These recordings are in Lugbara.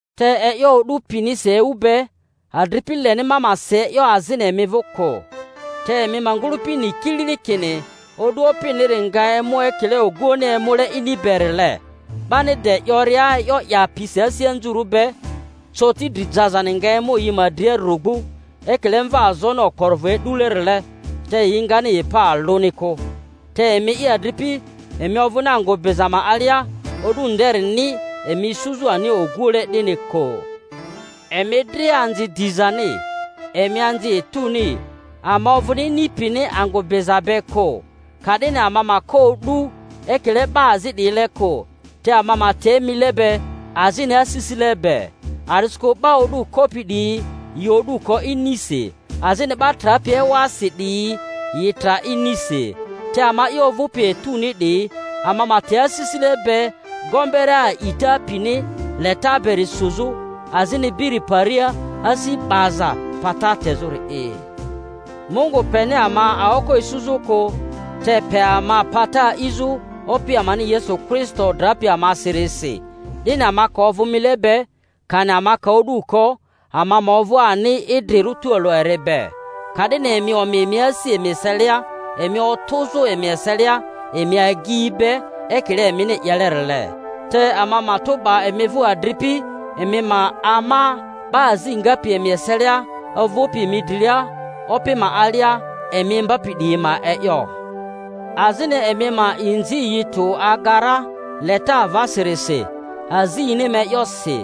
Te e'yo o'du pinisi ewu be, adripi, leni ma ma si e'yo azini emi vᴜ kᴜ. Te emi ma ngᴜlᴜpi ni kilili kini o'du Opiniri nga emu ekile oguoᴜni emule ini berile. 'Bani de 'yoria, E'yo 'yaa pi asi anzurᴜ be, coti dri jazani nga emu yi ma dria rugbu, ekile mvaazoni okporovᴜ e'dulerile, te yi ngani yi pa alᴜni kᴜ. Te emi'i, adripi, emi ovᴜni angᴜ biza ma alia, o'du nderini emi isuzᴜ ani oguoᴜle 'dini kᴜ. Emi dria anzi dizani, emi anzi etuni; ama ovᴜni ini pini angᴜ biza be kᴜ. Ka'dini ama ma ko o'du ekile 'ba azi 'diyile kᴜ, te ama ma te mile be azini asisile be. A'disikᴜ 'ba o'du kopi 'diyi yi o'du ko inisi, azini 'ba trapi ewasi 'diyi yi tra inisi. Te ama'i ovᴜpi etuni 'diyi, ama ma te asisile be, gombere a'ita pini leta beri suzᴜ, azini biri paria asi 'baza pata tezᴜri'i. Mungu peni ama aoko isuzᴜ kᴜ, te pe ama pata a'izᴜ Opi amani Yesu Kristo drapi amasirisi, 'dini ama ka ovᴜ mile be, kani ama ka o'du ko, ama ma ovᴜ ani idrirᴜ tualᴜ eri be. Ka'dini emi omi emi asi emi eselia, emi otᴜzᴜ emi eselia emi agyi be, ekile emini 'yelerile. Te ama matᴜ 'ba emi vᴜ, adripi, emi ma ama 'ba azi ngapi emi eselia, ovᴜpi emi drilia Opi ma alia, emi imbapi 'diyi ma e'yo, azini emi ma inzi yi tᴜ aga ra leta avasirisi azi yini ma e'yosi.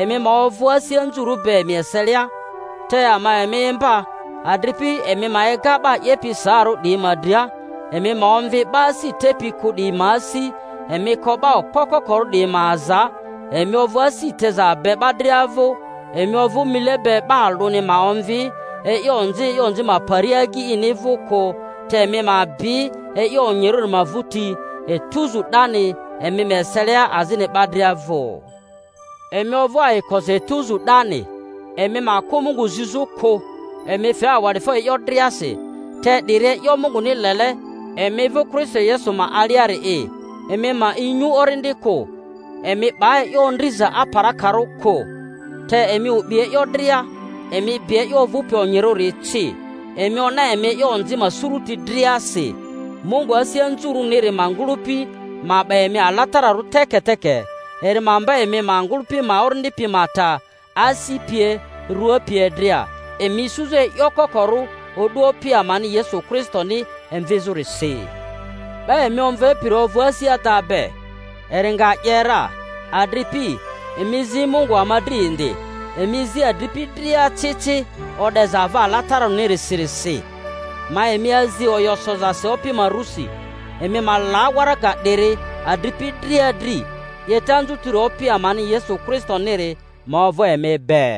Emi ma ovᴜ asi anzurᴜ be emi eselia. Te ama emi imba, adripi, emi ma ega 'ba 'yepi saarᴜ 'diyi ma dria, emi ma omvi 'ba asi tepi kᴜ 'diyi ma asi, emi ko 'ba okpo kokorᴜ 'diyi ma aza, emi ovᴜ asi teza be 'ba dria vᴜ. Emi ovᴜ mile be 'ba alᴜni ma omvi e'yo onzi e'yo onzi ma paria agyi ini vᴜ kᴜ, te emi ma bi e'yo onyirᴜri ma vᴜti etuzu 'dani emi ma eselia azini 'ba dria vᴜ. Emi ovᴜ ayikosi etuzu 'dani, emi ma kᴜ Mungu zizᴜ kᴜ, emi fe awa'difo e'yo driasi; te 'diri e'yo Munguni lele emi vᴜ Kristo Yesu ma aliari'i. Emi ma inyu Orindi kᴜ, emi 'ba e'yo ondriza aparakarᴜ kᴜ, te emi o'bi e'yo dria; emi bi e'yo ovᴜpi onyirᴜri ci, emi ona emi e'yo onzi ma suruti driasi. Mungu asi anzurᴜniri ma ngᴜlᴜpi ma 'ba emi alatararᴜ teke-teke; eri ma mba emi ma ngᴜlᴜpi ma orindi pi ma ta, asi pie, rua pie dria, emi isuzᴜ e'yo kokorᴜ o'du Opi ama-ni Yesu Kristoni emvizᴜrisi. 'Ba emi omvepiri ovᴜ asi ada be, eri nga 'ye ra. Adripi, emi zi Mungu ama dri indi. Emi zi adripi dria ci ci o'deza ava alatararᴜsirisi. Ma emi azi oyo sozasi Opi ma rusi, emi ma la waraga 'diri adripi dria dri. 'Yeta anzutiri Opi amani Yesu Kristoniri ma ovᴜ emi be.